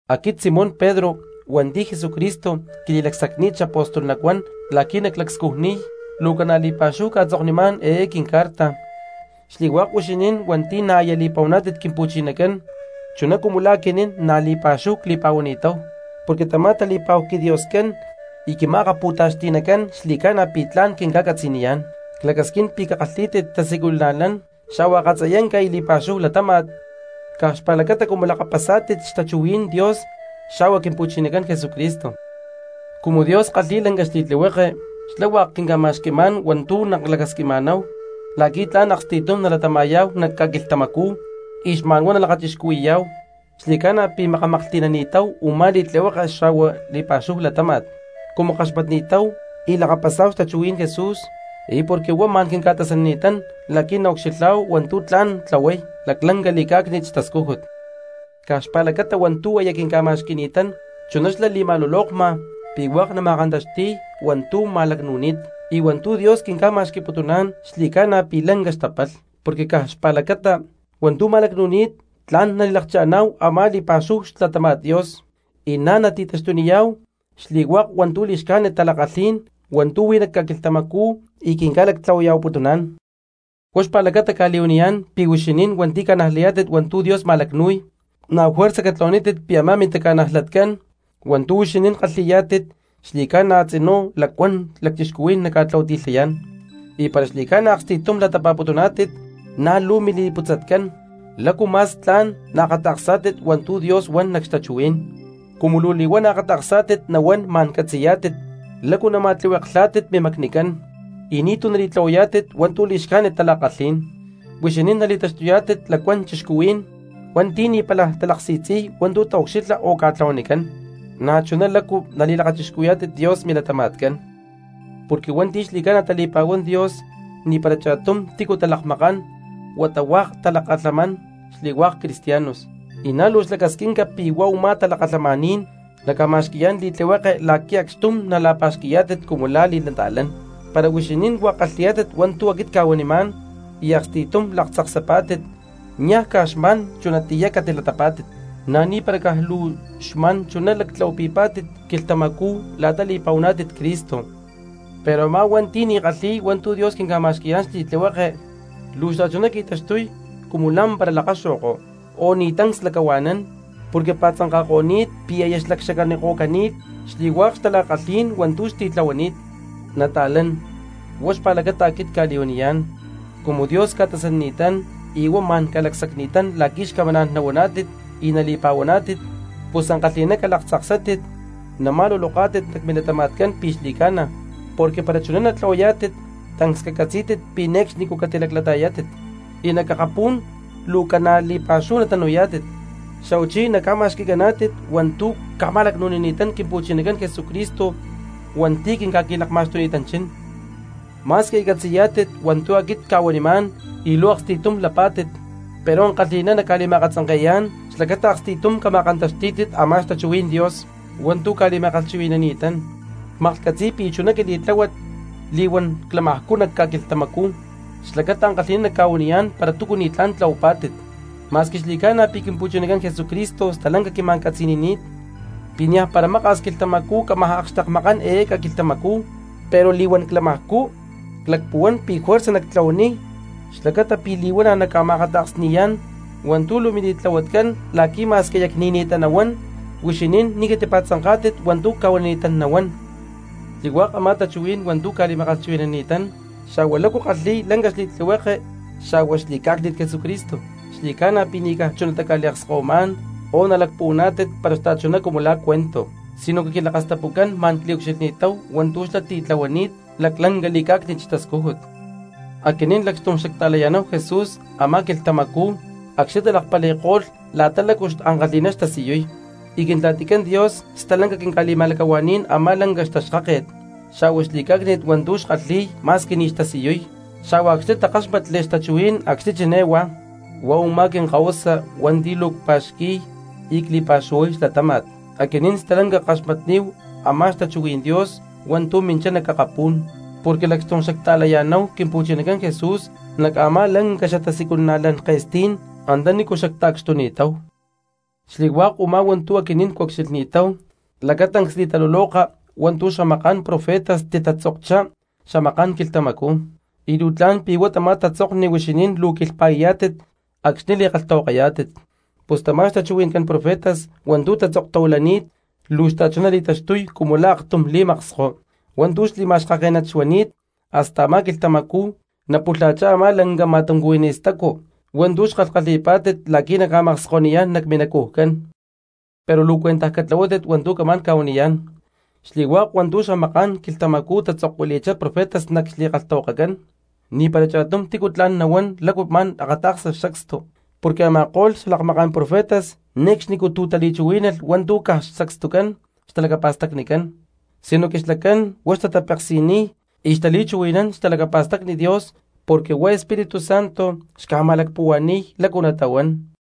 Aquit Simón Pedro hua̠nti̠ Jesucristo quili̠lacsacni̠t xapóstol nacuán la̠qui̠ naclacscujniy, luu ca̠na li̠pa̠xúhu cca̠tzoknimá̠n eé quincarta xli̠hua̠k huixinín hua̠nti̠ na̠ aya li̠pa̠huani̠tátit Quimpu̠chinacán chuná cumu la̠ aquinín na̠ li̠pa̠xúhu cli̠pa̠huani̠táhu, porque tamá tali̠pa̠hu quiDioscán y Quima̠akapu̠taxti̠nacán xli̠ca̠na pi̠ tla̠n quinca̠catzaniyá̠n. Clacasquín pi̠ cakalhí̠tit tasiculana̠lán xa̠hua akatziyanca y li̠pa̠xúhu latáma̠t caj xpa̠lacata cumu lakapasá̠tit xtachuhuí̠n Dios xa̠hua Quimpu̠chinacán Jesucristo. Cumu Dios kalhi̠y lanca xli̠tlihueke, xlá hua̠k quinca̠ma̠xqui̠má̠n hua̠ntu̠ maclacasquiná̠hu la̠qui̠ tla̠n aksti̠tum nalatama̠yá̠hu nac ca̠quilhtamacú y xma̠n huá nalakachixcuhui̠yá̠hu; xli̠ca̠na pi̠ makamaklhti̠nani̠táhu u̠má li̠tlihueke xa̠hua li̠pa̠xúhu latámat cumu kaxmatni̠táhu y lakapasá̠hu xtachuhuí̠n Jesús y porque huá ma̠n quinca̠tasanini̠tán la̠qui̠ naucxilhá̠hu hua̠ntu̠ tla̠n tlahuay laclanca li̠cá̠cni̠t xtascújut. Caj xpa̠lacata hua̠ntu̠ aya quinca̠ma̠xqui̠ni̠tán chuná xlá li̠ma̠lulokma pi̠ hua̠k nama̠kantaxti̠y hua̠ntu̠ ma̠lacnu̠ni̠t, y hua̠ntu̠ Dios quinca̠ma̠xqui̠putuná̠n xli̠ca̠na pi̠ lanca xtapalh, porque caj xpa̠lacata hua̠ntu̠ ma̠lacnu̠ni̠t tla̠n nali̠lakcha̠ná̠hu a̠má li̠pa̠xúhu xlatáma̠t Dios, y na̠ nati̠taxtuniyá̠hu xli̠hua̠k hua̠ntu̠ li̠xcájnit tala̠kalhí̠n hua̠ntu̠ huí nac ca̠quilhtamacú y quinca̠lactlahuaya̠huaputuná̠n. Huá xpa̠lacata cca̠li̠huaniyá̠n pi̠ huixinín hua̠nti̠ ca̠najlayá̠tit hua̠ntu̠ Dios ma̠lacnu̠y, na̠ juerza catlahuanítit pi̠ a̠má mintaca̠najlatcán hua̠ntu̠ huixinín kalhi̠yá̠tit xli̠ca̠na a̠tzinú lacuán cristianos naca̠tlahuati̠lhayá̠n, y para xli̠ca̠na aksti̠tum latapa̠putuná̠tit na̠ luu mili̠lacputzatcán lácu ma̠s tla̠n naakata̠ksá̠tit hua̠ntu̠ Dios huan nac xtachuhuí̠n. Cumu luu li̠huana̠ akata̠ksá̠tit nahuán ma̠n catzi̠yá̠tit lácu nama̠tlihueklhá̠tit mimacnicán y ni̠tu̠ nali̠tlahuayá̠tit hua̠ntu̠ li̠xcájnit tala̠kalhí̠n. Huixinín nali̠taxtuyá̠tit lacuán cristianos hua̠nti̠ ni̠tu̠ pála tali̠si̠tzi̠y hua̠ntu̠ taucxilha o ca̠tlahuanicán, na̠chuná lácu nali̠lakachixcuhui̠yá̠tit Dios mi̠latama̠tcán. Porque hua̠nti̠ xli̠ca̠na tali̠pa̠huán Dios ni̠para cha̠tum tícu talakmakán huata hua̠k talakalhamán xli̠hua̠k cristianos, y na̠ luu xlacasquinca pi̠ huá u̠má talakalhamaní̠n naca̠ma̠xqui̠yá̠n li̠tlihueke la̠qui̠ acxtum nala̠pa̠xqui̠yá̠tit cumu la̠ li̠nata̠lán. Para huixinín hua̠k kalhi̠yá̠tit hua̠ntu̠ aquit cca̠huanimá̠n y aksti̠tum laktzaksapá̠tit, niaj caj xma̠n chunatiyá catilatapá̠tit, na̠ ni̠para caj luu xma̠n chunatá lactlahuapi̠ni̠tátit quilhtamacú la̠ta li̠pa̠huaná̠tit Cristo. Pero a̠má cristiano hua̠nti̠ ni̠ kalhi̠y hua̠ntu̠ Dios quinca̠ma̠xqui̠yá̠n xli̠tlihueke, luu xta̠chuná qui̠taxtuy cumu lá̠mpara lakaxo̠ko o ni̠ tancs lacahua̠nán, porque pa̠tzanka̠ko̠ni̠t pi̠ aya xlacxacaniko̠cani̠t xli̠hua̠k xtala̠kalhí̠n hua̠ntu̠ xtitlahuani̠t. Nata̠lán, huá xpa̠lacata aquit cca̠li̠huaniyá̠n, cumu Dios ca̠tasanini̠tán y huá ma̠n ca̠lacsacni̠tán la̠qui̠ xcamaná̠n nahuaná̠tit y nali̠pa̠huaná̠tit, pus ankalhi̠ná calaktzaksátit nama̠luloká̠tit nac milatama̠tcán pi̠ xli̠ca̠na, porque para chuná natlahuayá̠tit tancs cacatzí̠tit pi̠ ne̠cxnicú catilaclata̠yátit. Y nac akapú̠n luu ca̠na li̠pa̠xúhu natanu̠yá̠tit xa̠huachí naca̠ma̠xqui̠caná̠tit hua̠ntu̠ ca̠ma̠lacnu̠nini̠tán Quimpu̠chinacán Jesucristo hua̠nti̠ quinca̠qui̠lakma̠xtuni̠tanchín. Ma̠squi aya catzi̠yá̠tit hua̠ntu̠ aquit cca̠huanimá̠n y luu aksti̠tumá lapá̠tit, pero ankalhi̠ná nacca̠li̠ma̠akatzanke̠yá̠n xlacata aksti̠tum cama̠kantaxtí̠tit a̠má xtachuhuí̠n Dios hua̠ntu̠ cca̠li̠ma̠kalhchuhui̠ni̠ni̠tán. Cmaklhcatzi̠y pi̠ luu chuná quili̠tláhuat li̠huán clamajcú nac ca̠quilhtamacú xlacata ankalhi̠ná nacca̠huaniyá̠n para túcu ni̠tlá̠n tlahuapá̠tit. Ma̠squi xli̠ca̠na pi̠ Quimpu̠chinacán Jesucristo stalanca quima̠catzi̠ni̠ni̠t pi̠ niaj para maka̠s quilhtamacú cámaj akxtekmakán eé ca̠quilhtamacú, pero li̠huán clamajcú clacpuhuán pi̠ juerza nactlahuaniy xlacata pi̠ li̠huana̠ nacca̠ma̠akata̠ksni̠yá̠n hua̠ntu̠ luu mili̠tlahuatcán la̠qui̠ ma̠squi aya cni̠ni̠ttá nahuán huixinín ni̠ catipa̠tzanká̠tit hua̠ntu̠ cca̠huanini̠tán nahuán. Xli̠hua̠k a̠má tachuhuí̠n hua̠ntu̠ cca̠li̠ma̠kalhchuhui̠ni̠tán xa̠hua lácu kalhi̠y lanca xli̠tlihueke xa̠hua xli̠cá̠cni̠t Jesucristo, xli̠ca̠na pi̠ ni̠ caj chunatá cca̠liakskahuimá̠n o nalacpuhuaná̠tit para xta̠chuná cumu la̠ cuento, sinoque quilakastapucán ma̠n cliucxilhni̠táhu hua̠ntu̠ xlá titlahuani̠t laclanca li̠cá̠cni̠t xtascújut. Aquinín lacxtum xacta̠laya̠náhu Jesús a̠má quilhtamacú acxni̠ talakpali̠ko̠lh la̠ta lácu ankalhi̠ná xtasiyuy y Quintla̠ticán Dios stalanca quinca̠li̠ma̠lacahuaní̠n a̠má lanca xtaxkáke̠t xa̠hua xli̠cá̠cni̠t hua̠ntu̠ xkalhi̠y ma̠squi ni̠ xtasiyuy, xa̠hua acxni̠ takáxmatli xtachuhuí̠n acxni̠ chiné huá: “Huá u̠má quinkahuasa hua̠nti̠ luu cpa̠xqui̠y y cli̠pa̠xuhuay xlatáma̠t.” Aquinín stalanca ckaxmatni̠táhu a̠má xtachuhuí̠n Dios hua̠ntu̠ minchá nac akapú̠n, porque lacxtum xacta̠laya̠náhu Quimpu̠chinacán Jesús nac a̠má lanca xatasiculana̠lán ke̠stí̠n antanícu xacta̠cxtuni̠táw. Xli̠hua̠k u̠má hua̠ntu̠ aquinín ctiucxilhni̠táhu lacatancs li̠taluloka hua̠ntu̠ xalakmaká̠n profetas titatzokchá xamaká̠n quilhtamacú, y luu tla̠n pi̠ huá tamá tatzokni huixinín luu quilhpa̠i̠yá̠tit acxni̠ li̠kalhtahuakayá̠tit. Pus tamá xtachuhui̠ncán profetas hua̠ntu̠ tatzoktahuilani̠t luu xta̠chuná li̠taxtuy cumu la̠ aktum li̠maksko hua̠ntu̠ xli̠macaxkaké̠nat xuani̠t hasta a̠má quilhtamacú napulha̠chá a̠má lanca ma̠tuncuhuiní stacu hua̠ntu̠ xkalhkalhi̠pá̠tit la̠qui̠ naca̠makskoniyá̠n nac minacujcán. Pero luu cuentaj catlahuátit hua̠ntu̠ camá̠n ca̠huaniyá̠n: xli̠hua̠k hua̠ntu̠ xamaká̠n quilhtamacú titzokuili̠chá profetas nac xli̠kalhtahuakacán, ni̠para cha̠tum tícu tla̠n nahua̠n lácu ma̠n akata̠ksa sacstu. Porque a̠ma̠ko̠lh lakmaká̠n profetas ne̠cxnicú tu̠ tali̠chuhuí̠nalh hua̠ntu̠ caj sacstucán xtalacapa̠stacnicán, sinoque xlacán huá xtatapeksi̠niy y xtali̠chuhui̠nán xtalacapa̠stacni Dios porque huá Espíritu Santo xca̠ma̠lacpuhua̠ni̠y lácu natahuán.